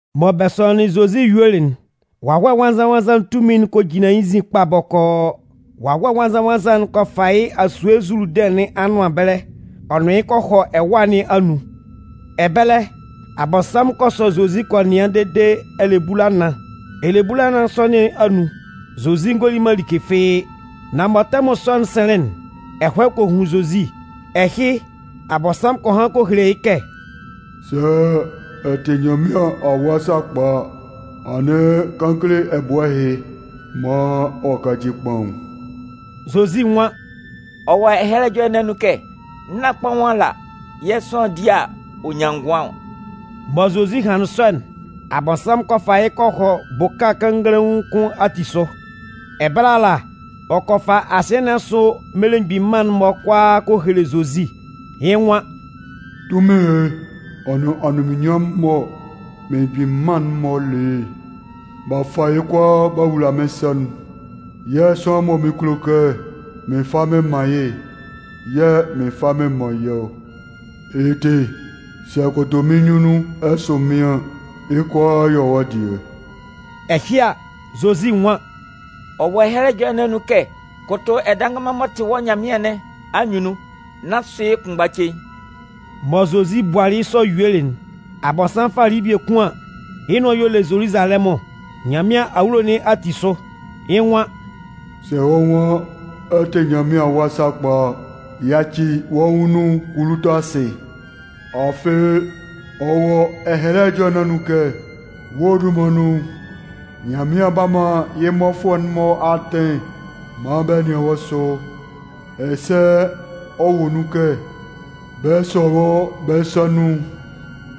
Mɔ bɛ sɔnlɩnlɩn Zozi yuelɩ'n, Wawɛ Nwannzan-nwannzan'n tunmin'n kɔ jinlan yɩ́ nzin kpa bɔkɔɔ. Wawɛ Nwannzan-nwannzan'n kɔ fa yɩ́ fi asue Zuludɩn nɩn anʋan ɛbɛlɛ ɔ nʋn yɩ́ kɔ hɔ ɛwâ nɩn anun. Ɛbɛlɛ, Abɔnsanmʋn kɔ sɔ Zozi kɔ nɩan dede ɛlɛbulanan. Ɛlɛbulanan sɔ nɩn anun, Zozi ngɔ li like fɩ́ɩ́. Nan mɔ tɛmʋn sɔ'n sɩnlɩn'n, ɛhɔɛ kɔ hun Zozi. Ɛhɩ, Abɔnsanmʋn kɔ han kɔ hele yɩ́ kɛ: “Sɛ ɛ tɩ Nyanmɩan Awa sakpa a, anɩn kan kele ɛbʋɛ ɛhɩ maan ɔ káci kpaʋn.” Zozi nwan: “Ɔ wɔ Ɛhɛlɛ Ɛjɔlɛ nɩn anun kɛ: Nán kpaʋn ala yɛ̂ sʋanlan di a, ɔ nyan ngʋan ɔ.” Mɔ Zozi hanlɩn sɔ'n, Abɔnsanmʋn kɔ fa yɩ́ kɔ hɔ bʋka kannganlaun kʋn ati sʋ. Ɛbɛlɛ ala, ɔ kɔ fa asɩɛ nɩn asʋ mmelemgbin mân'n-mɔ kʋalaa kɔ hele Zozi. Yɩ́ nwan: “Tunmin ɛhɩ ɔ nʋn anunminnyanmʋn'n mɔ mmelemgbin mân'n-mɔ le yɩ́'n, b'a fa yɩ́ kʋalaa b'a wula mɩ́n sa nun. Yɛ̂ sʋanlan mɔ mɩn kulo kɛ mɩn fa mɩn man yɩ́'n yɛ̂ mɩn 'fa mɩn man yɩ́ ɔ. Yɩ́ ti, sɛ ɛ kʋtʋ mɩ́n nyunnun ɛ sʋ mɩ́n an, yɩ́ kʋalaa 'yɔ wɔ́ dɩɛ.” Ɛhɩ a, Zozi nwan: “Ɔ wɔ Ɛhɛlɛ Ɛjɔlɛ nɩn anun kɛ: Kʋtʋ Ɛdannganman m'ɔ tɩ wɔ́ Nyanmɩan nɩn anyunnun nán sʋ yɩ́ kʋnmgba cein.” Mɔ Zozi bualɩ yɩ́ sɔ yuelɩ'n, Abɔnsanmʋn falɩ yɩ́ biekun an, yɩ́ nʋan y'ɔ le Zoluzalɛmʋn, Nyanmɩan awulo nɩn ati sʋ. Yɩ́ nwan: “Sɛ wɔ́ nwan ɛ tɩ Nyanmɩan Awa sakpa a, yaci wɔ́ nwʋn nun, kulu tɔ asɩ, afɩ, ɔ wɔ Ɛhɛlɛ Ɛjɔlɛ nɩn anun kɛ: Wɔ́ dunman nun, Nyanmɩan 'ba man yɩ́ mmɔfʋɛ'n-mɔ atɩn maan bɛ nɩan wɔ́ sʋ. Ɛsɛ ɔ wɔ nun kɛ: Bɛ 'sɔ wɔ́ bɛ́ sa nun,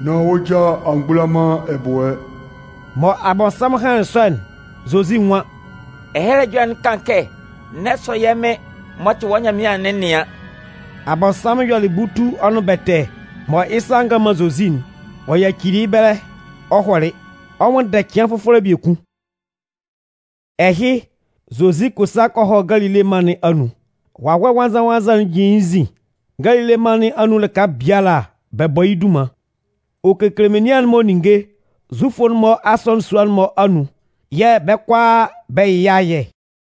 nán wɔ́ ja a mgbula man ɛbʋɛ.” Mɔ Abɔnsanmʋn hanlɩn sɔ'n, Zozi nwan: “Ɛhɛlɛ Ɛjɔlɛ'n kan kɛ: N'ɛ sɔ yɛ́ Mɩn m'ɔ tɩ wɔ́ Nyanmɩan'n nɩan.” Abɔnsanmʋn yɔlɩ butu ɔ nʋn bɛtɛ mɔ yɩ́ sa a ngan man Zozi'n, ɔ yacili yɩ́ ɛbɛlɛ ɔ hɔlɩ, ɔ 'nwʋnndɛ cɩan fʋfɔlɛ biekun. Ɛhɩ, Zozi kɔ sa kɔ hɔ Galile mân nɩn anun. Wawɛ Nwannzan-nwannzan'n tunmin'n jin yɩ́ nzin. Galile mân nɩn anun lɩka biala, bɛ bɔ yɩ́ dunman. Ɔ kekele menian'n-mɔ ninnge Zufʋ'n-mɔ asɔnɩn sua'n-mɔ anun yɛ̂ bɛ́ kʋalaa bɛ yɩ yɩ́ ayɛ.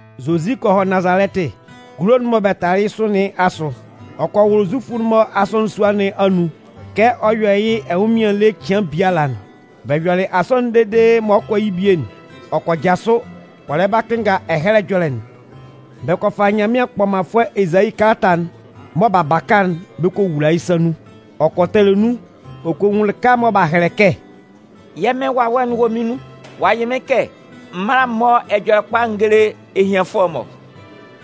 Zozi kɔ hɔ Nazalɛtɩ, kulo'n mɔ bɛ talɩ yɩ́ sʋ nɩn asʋ. Ɔ kɔ wʋlʋ Zufʋ'n-mɔ asɔnɩn sua nɩn anun kɛ ɔ yɔ yɩ́ ɛnwʋnmɩan ele cɩan biala'n. Bɛ yɔlɩ asɔnɩn'n dede mɔ ɔ 'kɔ bie'n, ɔ kɔ jasʋ, ɔ lɛ ba kɩnnga Ɛhɛlɛ Ɛjɔlɛ'n. Bɛ kɔ fa Nyanmɩan kpɔmanfʋɛ Ezayi kalata'n mɔ b'a baka'n bɛ kɔ wula yɩ́ sa nun. Ɔ kɔ tɛlɛ nun, ɔ kɔ nwun lɩka mɔ b'a hɛlɛ kɛ: Yɛ́ Mɩ́n Wawɛ'n wɔ mɩ́n nun ɔ'a yɩ mɩ́n kɛ m mála m mɔ́ Ɛjɔlɛkpa'n n géle ehianfʋɛ'n-mɔ.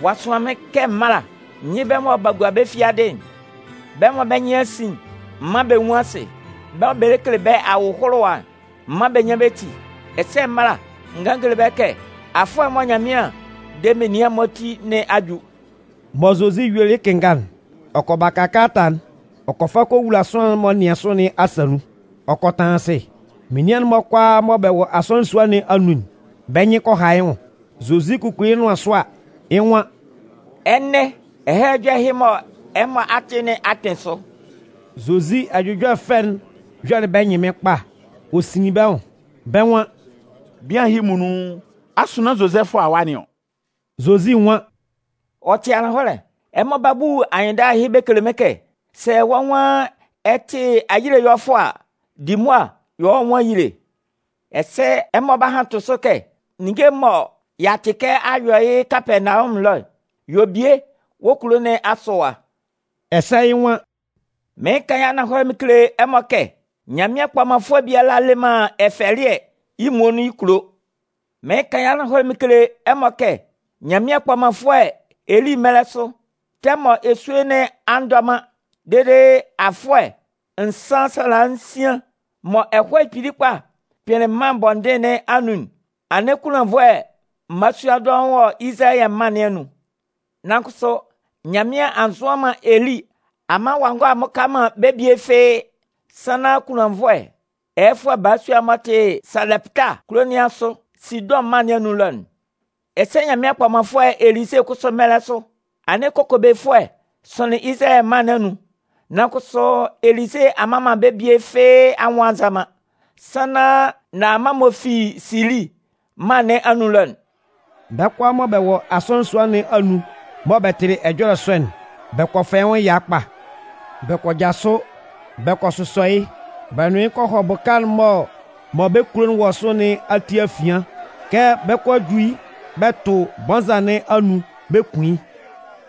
Ɔ'a sʋan mɩ́n kɛ m mála n yɩ́ bɛ́ mɔ b'a gua bɛ́ fiadɩ'n. Bɛ́ mɔ bɛ́ nyɩn a sin'n, m mán bɛ nwún asɩ. Bɛ́ mɔ bɛ lɛ kele bɛ́ ahʋlʋwa'n, m mán bɛ nyán bɛ́ ti. Ɛsɛ m mála n gán n géle bɛ́ kɛ afʋɛ'n mɔ Nyanmɩan 'de menian'n-mɔ ati nɩn a ju. Mɔ Zozi yuelɩ yɩ́ kɩnnga'n, ɔ kɔ baka kalata'n, ɔ kɔ fa kɔ wula sʋanlan'n m'ɔ nɩan sʋ nɩn asa nun, ɔ kɔ tanlan asɩ. Menian'n-mɔ kʋalaa mɔ bɛ wɔ asɔnɩn sua nɩn anun'n, bɛ́ nyɩn kɔ ha yɩ́ nwʋn. Zozi kukuli yɩ́ nʋan sʋ a, yɩ́ nwan: “Ɛnɛ, Ɛhɛlɛ Ɛjɔlɛ ɛhɩ mɔ ɛmɔ a tɩ nɩn a kpɩn sʋ.” Zozi ɛjʋjɔlɛ fɛ'n yɔlɩ bɛ́ ɛnyɩnmɩn kpa, ɔ sinlin bɛ́ nwʋn. Bɛ́ nwan: “Bian ɛhɩ muonun, asʋ nán Zozɛfʋ awa nɩn ɔ?” Zozi nwan: “Ɔ tɩ ananhɔlɛ, ɛmɔ 'ba bu anyɩnndala ɛhɩ bɛ kele mɩ́n kɛ: ‘Sɛ wɔ́ nwan ɛ tɩ ayile ɛyɔlɛfʋɛ a, di mʋa yɔ wɔ́ nwʋn ayile.’ Ɛsɛ ɛmɔ 'ba han tʋ sʋ kɛ: ‘Ninnge'n mɔ y'a tɩ kɛ a yɔ yɩ́ Kapɛɛnawɔmʋn ɛlɔ'n, yɔ bie wɔ́ kulo nɩn asʋ ɛwa.’” Ɛsɛ, yɩ́ nwan: “Mɩɩn kan yɩ́ ananhɔlɛ mɩn kele ɛmɔ kɛ Nyanmɩan kpɔmanfʋɛ biala le man ɛfɛlɩɛ yɩ́ muonun yɩ́ kulo. Mɩɩn kan yɩ́ ananhɔlɛ mɩn kele ɛmɔ kɛ Nyanmɩan kpɔmanfʋɛ Eli mɛlɛ sʋ, tɛmʋn mɔ esue nɩn a ndɔ man dede afʋɛ nsan sala nsian mɔ ɛhɔɛ kpili kpa kpɩnlɩn mân bɔndɩn nɩn anun'n, anɩn kunlannvʋɛ mmalasua dɔʋn wɔ Izalayɛ mân nɩn anun. Nan kʋsʋ, Nyanmɩan a nzʋan man Eli a man ɔ'a ngɔ a mmʋka man bɛ́ bie fɩ́ɩ́, sannan kunlannvʋɛ ɛyɛfʋɛ balasua'n m'ɔ tɩ Salɛpɩta kulo nɩn asʋ, Sidʋn mân nɩn anun ɛlɔ'n. Ɛsɛ Nyanmɩan kpɔmanfʋɛ Elize kʋsʋ mɛlɛ sʋ, anɩn kokobefʋɛ sʋnlɩn Izalayɛ mân nɩn anun. Nan kʋsʋ, Elize a mman bɛ́ bie fɩ́ɩ́ anwʋn a nza man, sannan Naaman m'ɔ fi Sili mân nɩn anun ɛlɔ'n.” Bɛ́ kʋalaa mɔ bɛ wɔ asɔnɩn sua nɩn anun mɔ bɛ tɩlɩ ɛjɔlɛ sɔ'n, bɛ kɔ fɛ yɩ́ nwʋn ɛya kpa. Bɛ kɔ jasʋ, bɛ kɔ sʋsɔ yɩ́, bɛ nʋn yɩ́ kɔ hɔ bʋka'n mɔ bɛ́ kulo'n wɔ sʋ nɩn ati afian kɛ bɛ 'kɔ a ju yɩ́ bɛ tʋ bɔnza nɩn anun bɛ kun yɩ́.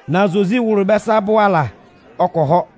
Nan Zozi wʋlʋlɩ bɛ́ sa abʋ ala, ɔ kɔ hɔ.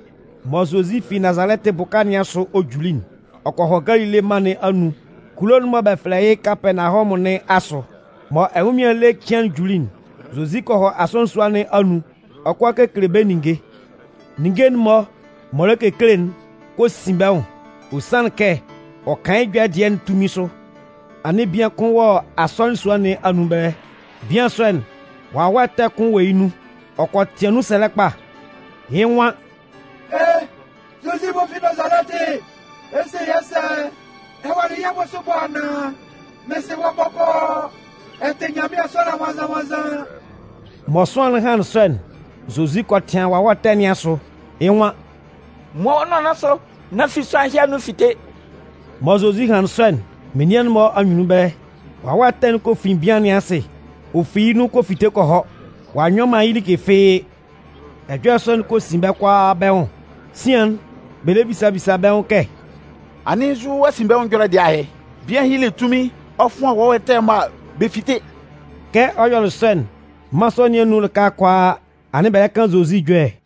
Mɔ Zozi fi Nazalɛtɩ bʋka nɩn asʋ ɔ juli'n, ɔ kɔ hɔ Galile mân nɩn anun kulo'n mɔ bɛ fɛlɛ yɩ́ Kapɛɛnawɔmʋn nɩn asʋ. Mɔ ɛnwʋnmɩan ele cɩan'n juli'n, Zozi kɔ hɔ asɔnɩn sua nɩn anun ɔ 'kɔ a kekele bɛ́ ninnge. Ninnge'n-mɔ m'ɔ lɛ kekele'n kɔ sin bɛ́ nwʋn, ɔ sanlɩn kɛ ɔ kan yɩ́ ɛjɔlɛ dɩɛ'n tunmin sʋ. Anɩn bian kʋn wɔ asɔnɩn sua nɩn anun ɛbɛlɛ. Bian sɔ'n, wawɛ ɛtɛ kʋn wɔ yɩ́ nun. Ɔ kɔ tɩan nun sɛlɛ kpa. Yɩ́ nwan: “E! Zozi m'ɔ fi Nazalɛtɩ, ɛ 'se yɛ́ sɛ? Ɛ walɩ yɛ́ bʋsʋ ɛbɔ anaan? Mɩn sɩ wɔ́ bɔkɔɔ! Ɛ tɩ Nyanmɩan Sʋanlan Nwannzan-nwannzan!” Mɔ sʋanlan'n hanlɩn sɔ'n, Zozi kɔ tɩan wawɛ ɛtɛ nɩn asʋ. Yɩ́ nwan: “Muan wɔ́ nʋan nɩn asʋ, nán fi sʋanlan ɛhɩ anun fite!” Mɔ Zozi hanlɩn sɔ'n, menian'n-mɔ anyunnun ɛbɛlɛ, wawɛ ɛtɛ'n kɔ fin bian nɩn asɩ, ɔ fi yɩ́ nun kɔ fite kɔ hɔ, ɔ'a nyɔ man yɩ́ like fɩ́ɩ́. Ɛjɔlɛ sɔ'n kɔ sin bɛ́ kʋalaa bɛ́ nwʋn, sian'n, bɛ lɛ bisa bisa bɛ́ nwʋn kɛ: “Anɩn nzu asinbɛnwʋn ɛjɔlɛ dɩɛ ahɩ? Bian ɛhɩ le yɩ́ tunmin'n ɔ fʋan wawɛ ɛtɛ'n-mɔ a, bɛ fite!” Kɛ ɔ yɔlɩ sɔ'n, mân sɔ nɩn anun lɩka kʋalaa, anɩn bɛ lɛ kan Zozi ɛjɔlɛ.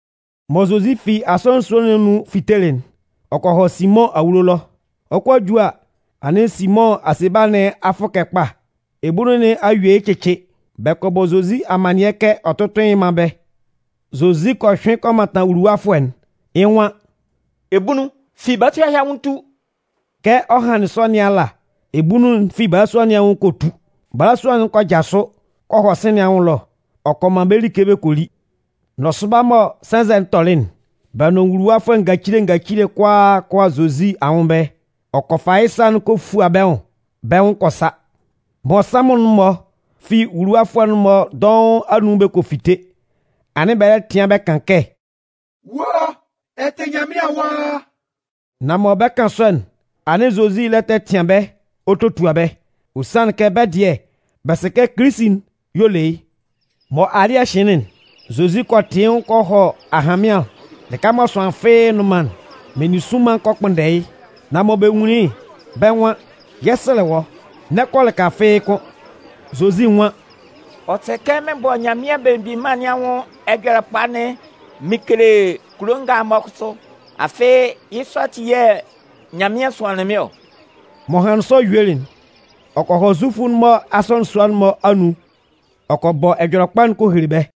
Mɔ Zozi fi asɔnɩn sua nɩn anun fitelɩ'n, ɔ kɔ hɔ Simʋn awulo ɛlɔ. Ɔ 'kɔ a ju a, anɩn Simʋn asebala nɩn a fʋkɛ kpa, ebunnun nɩn a yue yɩ́ cɩcɩ. Bɛ kɔ bɔ Zozi amannɩɛ kɛ ɔ tʋ́tʋn yɩ́ mán bɛ́. Zozi kɔ hyʋɩn kɔ mantan wuluwafʋɛ'n, yɩ́ nwan: “Ebunnun, fi balasua ɛhɩ anwʋn tu!” Kɛ ɔ hanlɩn sɔ nɩn ala, ebunnun'n fi balasua nɩn anwʋn kɔ tu. Balasua'n kɔ jasʋ kɔ hɔ sɩ̂n nɩn anwʋn ɛlɔ ɔ kɔ man bɛ́ like bɛ kɔ li. Nɔsʋba mɔ sɛnzɛ'n tɔlɩ'n, bɛ́ nʋn nwuluwafʋɛ ngacile ngacile kʋalaa kɔ 'a Zozi anwʋn ɛbɛlɛ. Ɔ kɔ fa yɩ́ sa'n kɔ fua bɛ́ nwʋn, bɛ́ nwʋn kɔ sa. Mmɔnsanmʋn'n-mɔ fi nwuluwafʋɛ'n-mɔ dɔʋn anun bɛ kɔ fite, anɩn bɛ lɛ tɩan bɛ kan kɛ: “Wɔ́, ɛ tɩ Nyanmɩan Awa!” Nan mɔ bɛ 'kan sɔ'n, anɩn Zozi lɛ tɛtɩan bɛ́ ɔ totua bɛ́, ɔ sanlɩn kɛ bɛ́ dɩɛ, bɛ sɩ kɛ Kilisi'n y'ɔ le yɩ́. Mɔ alɩ́ɛ hɩnlɩn'n, Zozi kɔ tɩ yɩ́ nwʋn kɔ hɔ ahanmɩan lɩka mɔ sʋanlan fɩ́ɩ́ nnʋn man'n. Meninsʋnman kɔ kpʋnndɛ yɩ́. Nan mɔ bɛ nwunlin yɩ́'n, bɛ́ nwan: “Yɛ 'sɛlɛ wɔ́, n'ɛ kɔ lɩka fɩ́ɩ́ kʋ́n.” Zozi nwan: “Ɔ sɛ kɛ mɩn bɔ Nyanmɩan Belemgbin Mân nɩn anwʋn Ɛjɔlɛkpa'n mɩn kele kulo nga'n-mɔ kʋsʋ. Afɩ yɩ́ sɔ ati yɛ̂ Nyanmɩan sʋanlɩn mɩ́n ɔ.” M'ɔ hanlɩn sɔ yuelɩ'n, ɔ kɔ hɔ Zufʋ'n-mɔ asɔnɩn sua'n-mɔ anun ɔ kɔ bɔ Ɛjɔlɛkpa'n kɔ hele bɛ́.